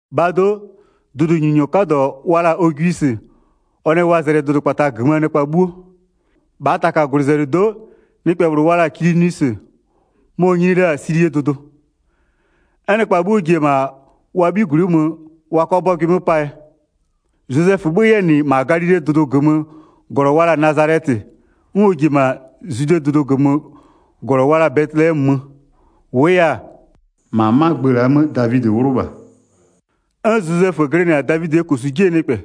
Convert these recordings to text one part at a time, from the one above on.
1-Bhaa do'o, dʋdʋnyininyɔ 'kadɔ wa la-a Ogwisɩ ɔ nɛ wa zɛlɩ dʋdʋkpata -gömöö nɩkpa 'bhuo. 2-Bhaa taka -gwlɩzɛlɩdo'o, nɩkpɛ -bhlʋ wa la-a Kilinwisɩ, mɔ-ɔ nyini la-a Silie dʋdʋ. 'N nɩkpa 'bhuo ji-e -ma wa 'bhigwlɩ'ɩ mö wa 'kʋa 'bɔgʋɩ 'mö 'paa yɛ. Zozɛfö 'bhö-ö 'yɛ -nɩ -ma Galilee dʋdʋ -gömöö -glɔ wa la-a Nazalɛtɩ, 'n ɔ ji-e -ma Zwidee dʋdʋ -gömöö -glɔ wa la-a Bɛtɩlɛmö mö, -wʋʋ yɛ-a, -ma 'ma gbë la'a 'mö Davidɩ 'wlʋ -bha, 'n Zozɛfö glɩnɩ-a Davidɩɛ -kosu 'jie nɩkpɛ.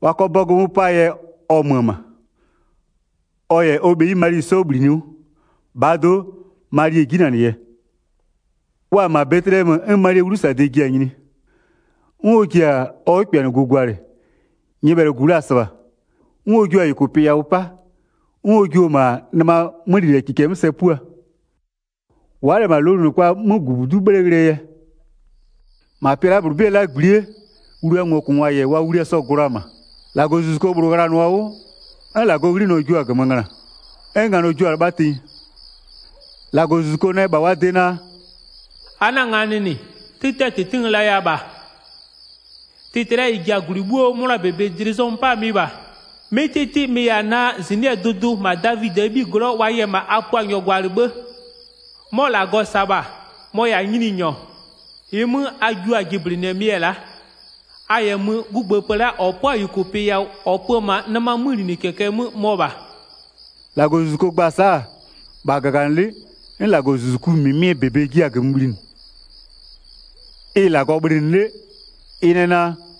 Wa 'kɔ 'bɔgʋ 'mö 'paa yɛ ɔ mö-ö -ma, ɔ -yɛ ɔ bheyi Mali 'sɔ -bhlinɩ 'wʋ. -Bhaa do'o Mali-e 'jinanɩ yɛ. Wa-a -ma Bɛtɩlɛmö 'n Malie 'wlusade ji-a nyini. 'N ɔ ji-a ɔ 'wʋkpɩanɩgu gwalɩ, nyɩbhɛlʋgu la-a -sɩbha. 'N ɔ jio-a -yʋkʋpɩ yawʋ 'pa, 'n ɔ jio-o -ma nɩmaa 'mölinɩkɩkɛ 'mö sɛ 'pua, wa'a -lɛ -ma lowlunɩkpaa 'mögʋbudu'u 'bhle ghlɩɛ yɛ. Sa -Lagɔzuzuko -sasanɩ-a wliaa ngokʋngwa 'dɩ 'mö 8-Ma pɩa la'a -bhlʋ 'bɩɛ 'lagbli'ie, wliaa ngokʋngwa -yɛ wa wlia sɔ-ɔ gʋ la-a -ma. 9-Lagɔzuzuko -bhlʋ ghlanʋa-a 'wʋ, 'n -Lagɔɔ 'ghlinɔ jua-a -gömö ngöna. 'N nganɔ jua-a 'lɩbha tenyi. 10-Lagɔzuzuko nɛ -bha wa de naa: “A 'na-a nganɩ -nɩ, 'tɩtɩɛ -tɩtɩ n laya -bha. Tɩtɩ la'a -ɩ ji-a -gwlɩ 'bhuo 'mʋnaa -bebe dlɩ zɔmö 'paa mɩ -bha. 'Mɩ 'tɩtɩ mɩ-ɩ -yɛ-a naa, -zɩnɩ'ɩɛ dʋdʋ, -ma Davidɩɛ 'bhiglɔ'ɔ wa yɛ -ma a Puanyɔ gwalɩ 'bhë, 'mɔ -Lagɔ -sa-a -bha, mɔ-ɔ -yɛ-a Nyininyɔ. 12-Ɩɩ 'mö a jio-a jɩblɩnɩɛ mɩ-ɛ la'a: A -yɛ mö, 'gugbëëpë la'a -ɔ 'pɔ-a -yʋkʋpɩ yawʋ, -ɔ pö-ö -ma nɩmaa 'mölinɩkɩkɛ 'mö mɔ -bha.” 13-Lagɔzuzuko gba-a sa'a, -bha -gaganɩlɩ'ɩ 'n -Lagɔzuzuku -mɩmɩɛ -bebe jia-a -gömö bhlinɩ, ɩ-ɩ -Lagɔ bhlɩnɩ 'le, ɩ nɛ naa: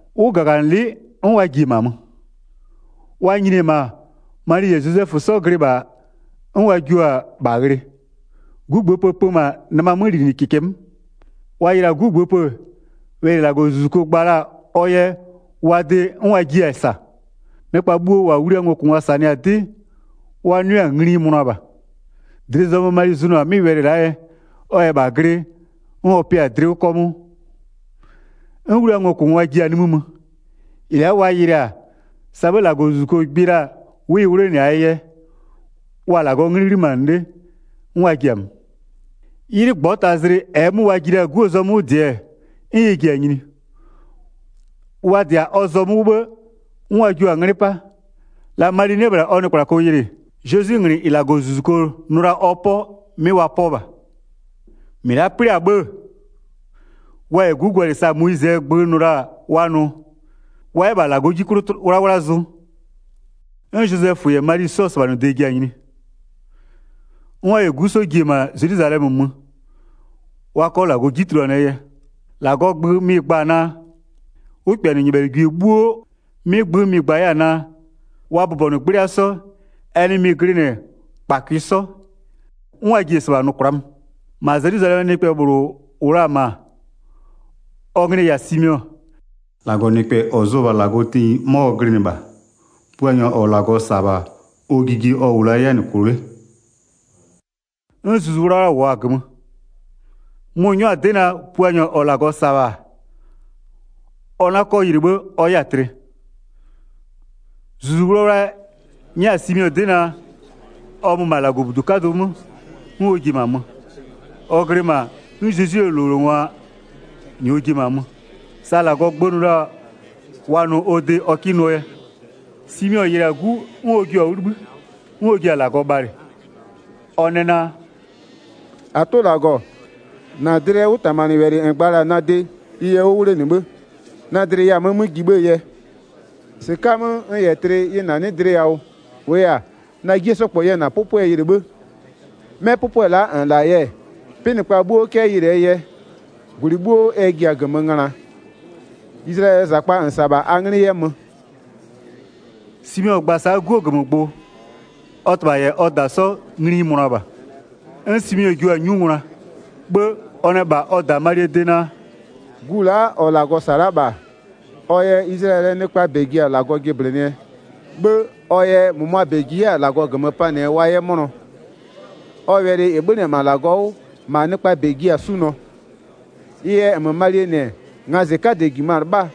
'Wʋ -gaganɩlɩ'ɩ 'n wa ji-e -ma mö. Wa nyini-e -ma, Mali -yɛ Zozɛfö 'sɔ glɩ -bha 'n wa jua-a -bha ghlɩ. 'Gugbëëpë pö -ma nɩmaa 'mölinɩkɩkɛ 'mö. Wa yɩlɩ-a 'gugbëëpë-ë, wɛlɩ -ɩ -Lagɔzuzuko gba la-a ɔ yɛ wa de 'n wa jiɩ-a -sa. Nɩkpa bhuo -wa wliaa ngokʋngwa -sanɩ-a 'dɩ, wa 'nʋɩ-a ngli ɩ mönʋa -bha. Dlɩ zɔmö Mali zʋnʋ-a 'mɩ wɛlɩ la'a yɛ, ɔ -yɛ -bha glɩ 'n ɔ pɩ-a dlɩ 'wʋ 'kɔmʋʋ. 'N wliaa ngokʋngwa ji-a nimï mö. -Ɩ la'a wa yɩlɩ-a, sa 'bhë -Lagɔzuzuko gbɩ la-a 'wʋ ɩ 'wlenɩ-aa yɛ, wa-a -Lagɔɔ 'nglɩ 'ghlimanɩ 'le 'n wa ji-a mö. 'Ylɩ -ngbɔtazlɩ -ɛɛ 'mö wa ji la-a 'guo zɔmö 'wʋ -dɩ-ɛ, 'n ɛ ji-a nyini. Wa -dɩ-a ɔ zɔmö 'wʋ 'bhë, 'n wa jio-a 'nglɩ 'pa. La Mali 'nɩ-ɛ -bhla ɔ nɩkplako yɩlɩ, Zezwinglɩ -ɩ -Lagɔzuzuko nʋ la-a ɔ 'pɔ 'mɩ wa 'pɔ -bha. Wa yɛ Zezwi -ma -Lagɔbudu 'kadʋ 'mö tulua kwla'a mö 22-Mɩ la'a 'plɩ-a 'bhë-ë, wa -yɛ 'gu gwalɩ sa Moyizɩɛ gbö nʋ la-a wa nʋ, wa 'yɛ -bha -Lagɔɔ 'ji 'klʋ 'wlawla zʋ, 'n Zozɛfö -yɛ Mali 'sɔɔ -sɩbhanʋde ji-a nyini. 'N wa -yɛ 'gu 'sɔ ji-e -ma Zelwizalɛmö mö, wa 'kɔ -Lagɔ 'ji tuluanɩɛ yɛ. 23-Lagɔɔ gbö mɩ-ɩ gba-a naa: 'Wʋkpɩanɩnyɩbhɛlɩgwie 'bhuo wa 'nyʋa -Lagɔ 'ye. 'Mɩ gbö mɩ-ɩ gba 'yɛ-a naa: Wa bʋbɔnʋ 'gblɩa 'sɔ, ɛ nɩ mɩ-ɩ glɩnɩ -kpakʋɩ 'sɔ, 'n wa ji-a -sɩbha nʋ kwla'a mö. Simeɔ yɛ Zezwie -gbëëpë yɩlɩ 25-Ma Zelwizalɛmö nɩkpɛ -bhlʋ -wʋ la-a -ma, ɔ nglɩ-ɩ -yɛ-a Simeɔ, -Lagɔnɩkpɛ -ɔ zʋ-ɔ -bha -Lagɔ tenyi 'mɔ ɔ glɩnɩ -bha. Puanyɔ -ɔ -Lagɔ -sa-a -bha, ɔ jijie ɔ -wʋ la-a 'yɛ-a -nɩ -kʋ 'le. 'N Zuzu 'Wlawla -wʋɔ la-a -gömö. Mʋ-ʋ 'nyɔ-a 'dɩ naa, Puanyɔ -ɔ -Lagɔ -sa-a -bha, ɔ 'na 'kɔ yɩlɩ 'bhë ɔ 'yɛ-a tlɩ. Zuzu 'Wlawla nyɛ-a Simeɔ 'dɩ naa, ɔ mö -ma -Lagɔbudu 'kadʋ 'mö, 'n ɔ ji-e -ma mö. Ɔ glɩ -ma 'n Zezwie -lowlengwa -nyɔɔ ji-e -ma mö, sa -Lagɔɔ gbö nʋ la-a wa nʋ ɔ de wa 'kɩ nʋɔ yɛ. Simeɔ yɩlɩ-a 'gu 'n ɔ jio-a 'wʋ 'libhï. 'N ɔ ji-a -Lagɔ bhalɩ. Ɔ nɛ naa: “-Atʋ -Lagɔ, -na dlɩɛ 'wʋtamanɩwɛlɩ -n gba la-a na de, ɩ yɛ 'wʋ 'wlenɩ 'bhë. Na dlɩ yɛ-a 'mö 'mö ji 'bhëë yɛ, -sɩka'a-a 'mö n -yɛ tlɩ ɩ -nanɩ'ɩ dlɩ yawʋ. 30-Wʋʋ yɛ-a, na 'jie 'sɔ -kpɔ yɛ -na 'pʋpʋɛ yɩlɩ 'bhë. 'Mɛ 'pʋpʋɛ la'a -n -la-a yɛ, 'pɩnɩkpa 'bhuo 'kɛ yɩlɩɛ yɛ. 32-Gwlɩ 'bhuo ɛ ji-a -gömö ngönaa. Izlayɛlɩɛ -zakpa -n -sa-a -bha, a 'nglɩ 'yɛ mö.” Simeɔ gba-a sa'a 'guo -gömögbʋ, ɔ -tɩbha -yɛ ɔ -da 'sɔ ngli ɩ mönʋa -bha. 'N Simeɔ jua-a 'nyu ngwla, 'bhë ɔ nɛ -bha -ɔ -da Malie de naa: “Gu la'a -ɔ -Lagɔ -sa-a la'a -bha, ɔ yɛ Izlayɛlɩɛ nɩkpaa -bɛ ji-a -Lagɔ jɩblɩnɩɛ, 'bhë ɔ yɛ -mʋmʋaa -bɛ ji 'yɛ-a -Lagɔ -gömö panɩɛ wa 'yɛ 'mʋnɔ. Ɔ wɛlɩ -ɩ 'bhönɩ-ɛ -ma -Lagɔ 'wʋ, -ma nɩkpaa -bɛ jiɩ-a 'sunʋɔ. Ɩ yɛ -nmö Malie -nɩ-ɛ, ngazɩ 'kadɛ -jimö-a 'lɩbhaa,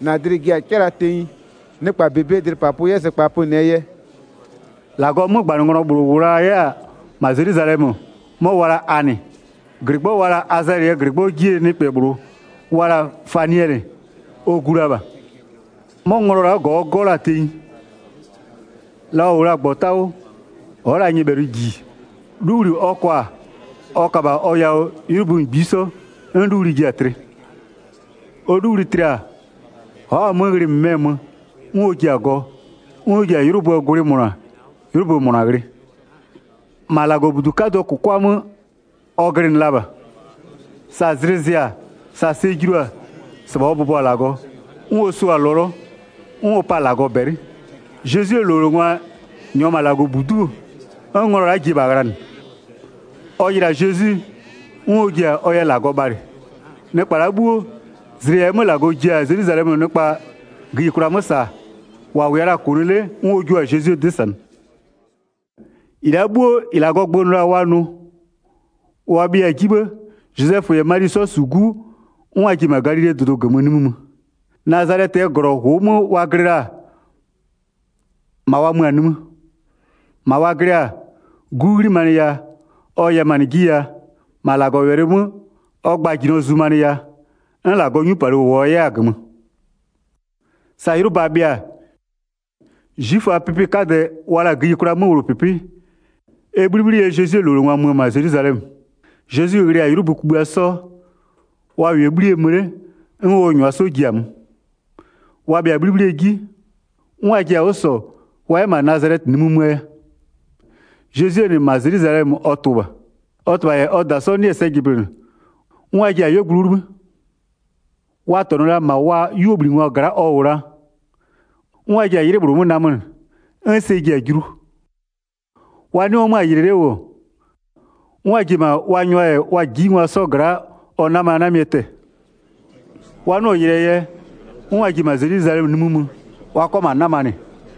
-na dlɩ-ɩ ji-a 'cɩla tenyi, nɩkpa -bebee dlɩpapʋ 'yɛ zɩkpa pönɩɛ yɛ.” -Lagɔɔ 'mögbanɩnglɔ Anɩ yɛ -Lagɔ bhlɩnɩ 36-Lagɔɔ 'mögbanɩnglɔ -bhlʋ -wʋ la 'yɛ-ɛ -ma Zelwizalɛmö, 'mɔ wa la-a Anɩ. -Glɩgbɔ wa la-a Azɛlɩɛ -glɩgbɔ 'jie nɩkpɛ -bhlʋ wa la-a Faniɛlɩ, ɔ gu la -bha. 'Mɔ nglɔ la'a -gɔ ɔ 'gɔ-ɔ la-a tenyi. La ɔ -wʋ la-a -gbɔta 'wʋ ɔ'ɔ la-a nyɩbhɛlʋ -ji 'luwli ɔ kwa-a, ɔ ka -bha ɔ yawʋ 'ylʋbö -ngbisɔ 'n 'luwli ji-a tlɩ. Ɔ 'luwli tlɩ-a ɔ'ɔ-a 'mö ghlɩ -mɩmɛ mö 'n ɔ ji-a gɔ, 'n ɔ ji-a 'ylʋböö gwlɩ -mʋna 'ylʋbö -mʋna ghlɩ. -Ma -Lagɔbudu 'kadʋɔ -kʋkwa 'mö ɔ glɩnɩ la -bha. Sa zlɩ zɩ-a sa sɛ julu-a, -sɩbha ɔ bʋbɔ-a -Lagɔ, 'n ɔ sʋ-a lɔlɔ 'n ɔ pa-a -Lagɔ -bɛlɩ. Zezwie -lowlengwa -nyɔɔ -ma -Lagɔbudu'u, 'n nglɔ la'a ji-e -bha ghlanɩ. Ɔ yɩlɩ-a Zezwi 'n ɔ ji-a ɔ yɛ -Lagɔ bhalɩ. Nɩkpa la'a 'bhuo, zlɩ -ɛɛ 'mö -Lagɔ ji-a Zelwizalɛmöö nɩkpa gïyikwla 'mö -saa, -wa -wʋɛ la-a -kʋnʋ 'le-e, 'n ɔ jua-a Zezwie 'dɩ -sanɩ. Zezwie -lowlengwa yɛ -ma Nazalɛtɩ nimï mö 39-Ɩ la'a 'bhuo -ɩ -Lagɔɔ gbö nʋ la-a wa nʋ, wa bhɩɩa-a 'ji 'bhë-ë, Zozɛfö -yɛ Mali 'sɔ -su 'gu 'n wa ji-e -ma Galilee dʋdʋ -gömö nimï mö. Nazalɛtɩɛ -glɔ -ʋʋ 'mö wa glɩ la-a, -ma wa mö-a nimï. 40-Ma wa glɩ-a, 'gu 'ghlimanɩ yaa, ɔ yɛmanɩ 'ji yaa, -ma -Lagɔwɛlɩ 'mö ɔ gbajinɔ zumanɩ yaa, 'n -Lagɔɔ 'nyupalɩ -wʋɔ 'yɛ-a -gömö. Sa 'ylʋba bhɩa-a, 'zwiföaa 'pɩpɩ 'kadɛ wa la-a gïyikwlaa 'möwlʋpɩpɩ ɛ 'bhlibhli yɛ Zezwie -lowlengwa mö-ö -ma Zelwizalɛmö. Zezwi ghlɩ-a 'ylʋbö kugbïa 'sɔ, wa -wʋɛ-a 'bhlie mö 'le 'n ɔ -nyʋa 'sɔ ji-a mö. Wa bhɩa-a 'bhlibhlie 'ji, 'n wa ji-a 'wʋ -sɔ wa 'yɛ -ma Nazalɛtɩ nimï möö yɛ. Zezwie -nɩ, -ma Zelwizalɛmö ɔ tʋ-ʋ -bha. Ɔ -tɩbha -yɛ ɔ -da 'sɔ 'nɩ-ɛ sɛ jɩblɩnɩ, 'n wa ji-a 'yuogblʋ 'wʋ 'libhï. Wa -tɔnʋ la -ma wa 'yuobhlingwa gla'a ɔ -wʋ la, 'n wa ji-a 'ylɩ -bhlʋ 'mö namönɩ, 'n sɛ ji-a julu. Wa 'nɩɔ 'mö-a yɩlɩ 'le -wʋ, 'n wa ji-e -ma wa nyʋa -yɛ wa -jijingwa 'sɔ gla'a ɔ 'namanamɩɛ tɛ-ɛ. Wa 'nɩɔ-ɔ yɩlɩɛ yɛ, 'n wa ji-e -ma Zelwizalɛmö nimï mö wa 'kɔ -ma 'namanɩ.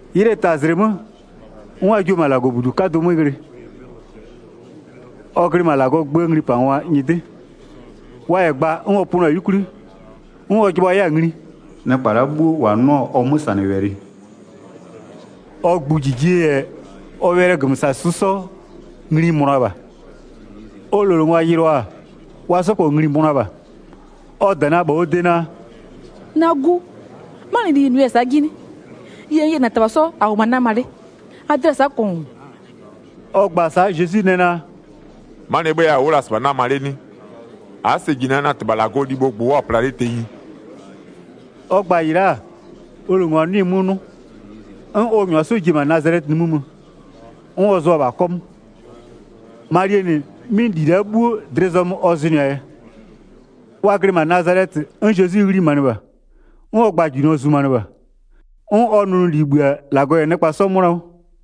'Ylɩɛ tazlɩ 'mö, 'n wa jio-o -ma -Lagɔbudu 'kadʋ 'mö ghlɩ, ɔ glɩ -ma -Lagɔɔ gböö nglipangwa nyɩdɩ. Wa -yɛ gba 'n ɔ pönʋa-a 'yukwli, 'n ɔ jɩbhʋa 'yɛ-a ngli. Nɩkpa la'a 'bhuo -wa 'nʋ-a ɔ 'mösanɩwɛlɩ, ɔ gbʋjijie -yɛ ɔ wɛlɩɛ -gömösasʋ 'sɔ ngli ɩ mönʋa -bha. Ɔ -lowlengwa yɩlɩɔ-a, wa 'sɔ -kpɔ ngli-i mönʋa -bha. Ɔ -da nɛ -bha ɔ de naa: “Na 'gu, 'manɩli -n -nʋya-a sa'a 'ji 'nɩ? Yie, n -yɛ -na -tɩbha 'sɔ -a -wʋmö-a 'nama 'le -aa dlɩa-a sa'a -kɔngʋ.” Ɔ gba-a sa'a Zezwi nɛ naa: “'Manɩɛ 'bhëë yɛ a wʋ'ʋ la-a -sɩbha 'nama 'le 'nɩ? A'a sɛ -ji naa na -Tɩbha -Lagɔɔ libhoo gbʋ-ʋ wʋ'ʋ-a pla 'le tenyi?” Ɔ gba-a -ɩ la'a, ɔ -lowlengwa 'nɩɩ-ɩ 'mö 'nʋ. 'N ɔ -nyʋa 'sɔ ji-e -ma Nazalɛtɩ nimï mö, 'n ɔ zʋa-a -bha 'kɔmʋʋ. Malie -nɩ 'mɩ -li la'a 'bhuo dlɩ zɔmö ɔ zʋnʋɩ-a yɛ. Wa glɩ -ma Nazalɛtɩ 'n Zezwi 'ghlimanɩ -bha, 'n ɔ gbajinɔ zumanɩ -bha. 'N ɔ nʋnʋli -bhï-a -Lagɔ -yɛ nɩkpa 'sɔ 'mʋna 'wʋ.